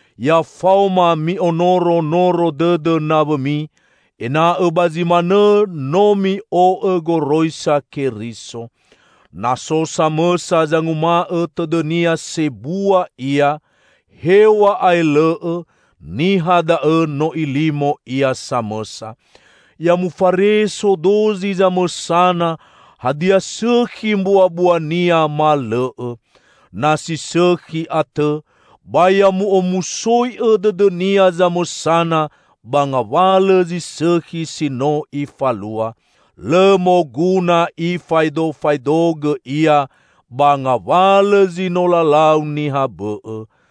Ya faoma mi'onoro noro dõdõ nawõmi, ena'õ ba zi manõ no mi'o'õ goroisa Keriso. Na so samõsa zanguma'õ tõdõnia sebua ia, hew̃a'ae lõ'õ, niha da'õ no ilimo ia samõsa. Ya mufareso dozi zamõsana hadia sõkhi mbuambuania, ma lõ'õ. Na si sõkhi atõ, ba ya mu'omusoi'õ dõdõnia zamõsana ba ngawalõ zi sõkhi si no ifalua. Lõ moguna ifaedofaedogõ ia ba ngawalõ zi no lalau niha bõ'õ.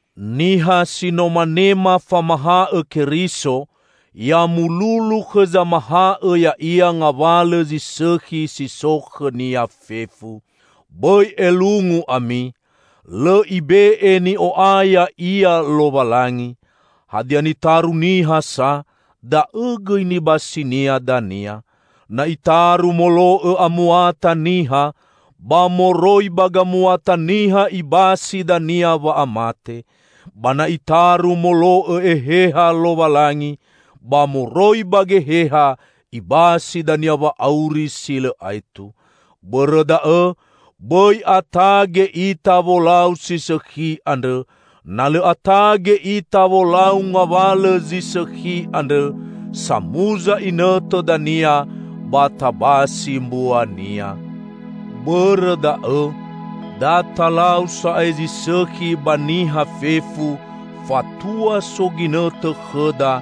Niha si no manema famaha'õ Keriso, ya mululu khõ zamaha'õ ya'ia ngawalõ zi sõkhi si so khõnia fefu. Bõi elungu ami. Lõ ibe'e ni'o'aya Ia Lowalangi! Hadia nitaru niha sa, da'õ gõi nibasinia dania. Na itaru molo'õ amuata niha, ba moroi ba gamuata niha ibasi dania wa'amate. Ba na itaru molo'õ Eheha Lowalangi, ba moroi ba Geheha ibasi dania wa'auri si lõ aetu. Bõrõ da'õ, bõi atage ita wolau si sõkhi andrõ; na lõ atage ita wolau ngawalõ zi sõkhi andrõ, samuza inõtõ dania ba tabasi mbuania. Bõrõ da'õ, da talau sa'ae zi sõkhi ba niha fefu, fatua so ginõtõ khõda,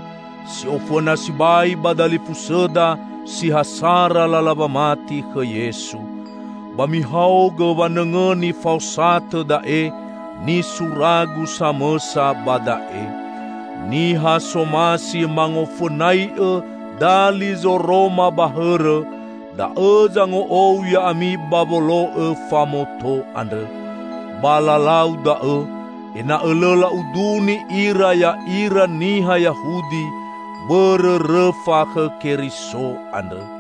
si ofõna sibai ba dalifusõda si ha sara lala wamati khõ Yesu. Ba mihaogõ wanõngõni faosatõ da'e, nisuragu samõsa ba da'e. Niha somasi mangofõnai'õ dali zoroma ba hõrõ, da'õ zango'ou ya'ami ba wolo'õ famoto andrõ. Ba lalau da'õ, ena'õ lõ la'uduni ira ya'ira niha Yahudi bõrõ rõfa khõ Keriso andrõ.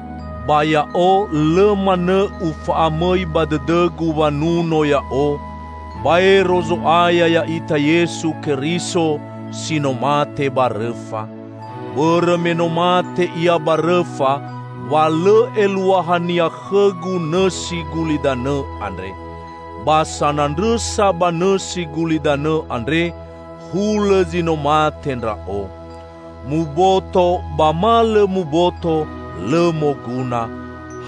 Ba ya'o lõ manõ ufa'amõi ba dõdõgu wanuno ya'o, baero Zo'aya ya'ita Yesu Keriso, si no mate ba rõfa. Bõrõ me no mate Ia ba rõfa, wa lõ eluahania khõgu nõsi gulidanõ andre. Ba sanandrõsa ba nõsi gulidanõ andre, hulõ zi no mate ndra'o. Muboto ba ma lõ muboto, lõ moguna.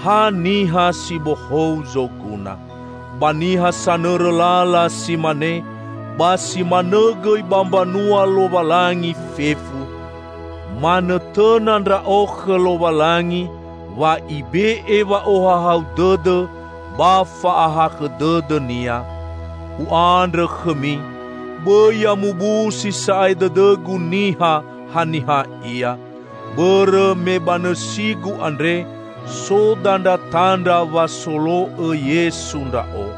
Ha niha si bohou zoguna. Ba niha sanõrõ lala si mane, ba si manõ gõi ba mbanua Lowalangi fefu, manõtõna ndra'o khõ Lowalangi wa Ibe'e wa'ohahau dõdõ ba fa'ahakhõ dõdõ-Nia. U'andrõ khõmi, bõi ya mubusi sa'ae dõdõgu niha, haniha ia. Bõrõ me ba nõsigu andre so dandratandra wa solo'õ Yesu ndra'o.